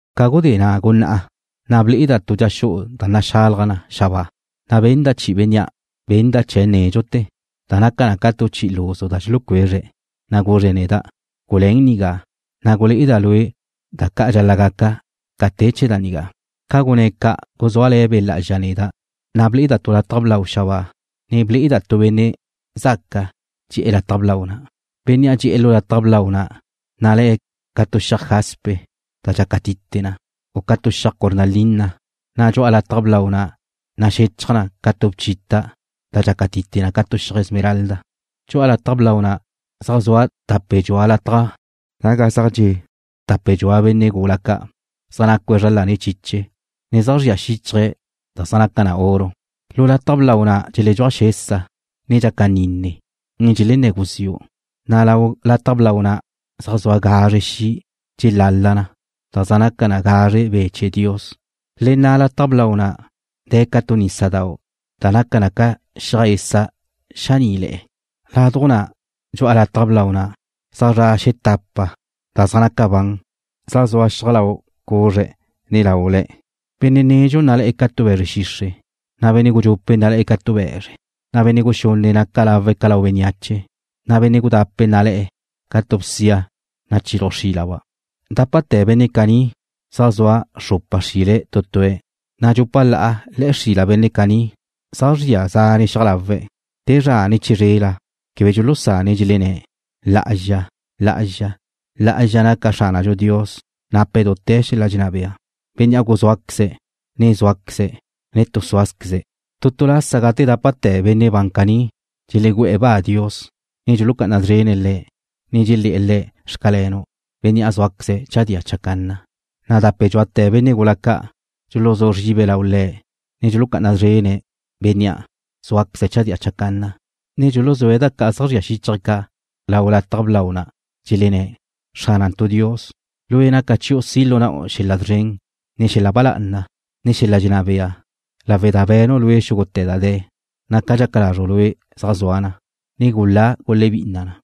Ca gudé na' gunná'a, na' ble'eda' tu dxa xu'u da naxalaj na xabáa, na' benda' chi'i Bénnea' benda' chee̱' nédxute̱ da naca na ca chi'i luzu da dxulucuezre̱', na' guzre̱' neda': ―Guluén nigá, na' gulé'eda' lue' da ca' dxal-la' gaca ca te chee̱ da nigá. Ca gunné̱' ca' guzúale̱ Be' Lá'azxa neda', na' ble'eda' tu lataj blau xabáa, ne ble'eda' tu Benne' zaca dxe'e̱ lataj blau na'. Bénnea' dxe'e̱ lu lataj blau na' nalé̱' ca tu xiaj jaspe da dxácatite na, u ca tu xiaj cornalina, na' dxu'a lataj blau na' naxechaj ca tu bchita' da dxácatite na ca tu xiaj esmeralda. Dxu'a lataj blau na' zaj zua tape dxua lataj naga zaj dxe' tape dxua benne' gula ca', zaj nacue̱' zra lane̱' chiche, ne zaj zria xíchaje̱' da zaj naca na oro. Lu lataj blau na' dxeledxúaj xesa, ne dxaca nine, ne dxelenné̱ guziu', na' lau lataj blau na' zaj zua gazre xi' dxelala na, da zaj naca na gazre Be' chee̱ Dios. Le na' lau lataj blau na' de̱ ca tu nísadau' da naca na ca xiaj esa' xaní'le̱'e̱. Laduj na' dxu'a lataj blau na' zaj zra' xetapa da zaj naca ban, zaj zua xiaj lau cuzre̱', ne laule̱'. Benne' nedxu nalé̱'e̱ ca tu be̱zre xixre', na' benne' gudxupe' nalé̱'e̱ ca tu be̱zre, na' benne' guxunne' naca lawe̱' ca lau bénneache, na' benne' gudape' nalé̱'e̱ ca tu bsia nachiluj xílaba'. Dápate̱ benne' caní zaj zua xrupa xrile̱' tu tue̱', na' dxupa la'a le̱'e̱ xrila benne' caní zaj zria zane' xiaj lawe̱'. Te zra ne chizrela quebe dxulusane̱' dxelenné̱': Lá'azxa, lá'azxa, lá'azxa naca Xránadxu Dios nape̱' dute̱ xel-la' dxenná bea, Bénnea' guzúaqueze̱', ne zúaqueze̱', ne tu súazqueze̱'. Tu tu lasa gate dápate̱ benne' ban caní dxelegú'e̱ ba Dios, ne dxulucá'ana szrene̱' Le̱', ne dxelé̱'e̱ Le̱': Xcalenu', Bénnea' zúaqueze̱' chadía chacanna, na' dape dxuate̱ benne' gula ca' dxuluzú zribe̱' lau Le̱', ne dxulucá'ana szrene̱' Bénnea' zúaqueze̱' chadía chacanna, ne dxuluzúe̱' da ca' zaj zría xíchaje̱' ca' lau lataj blau na', dxelenné̱': Xránantu' Dios, Lue' naca chiu' si' lu na'u xel-la' szren, ne xel-la' ba lá'ana, ne xel-la' dxenná bea, lawe' da be̱nu' Lue' xúgute̱ da de̱, na' ca dxaca lazru' Lue' zaj zua na, ne gulá gulebinna na.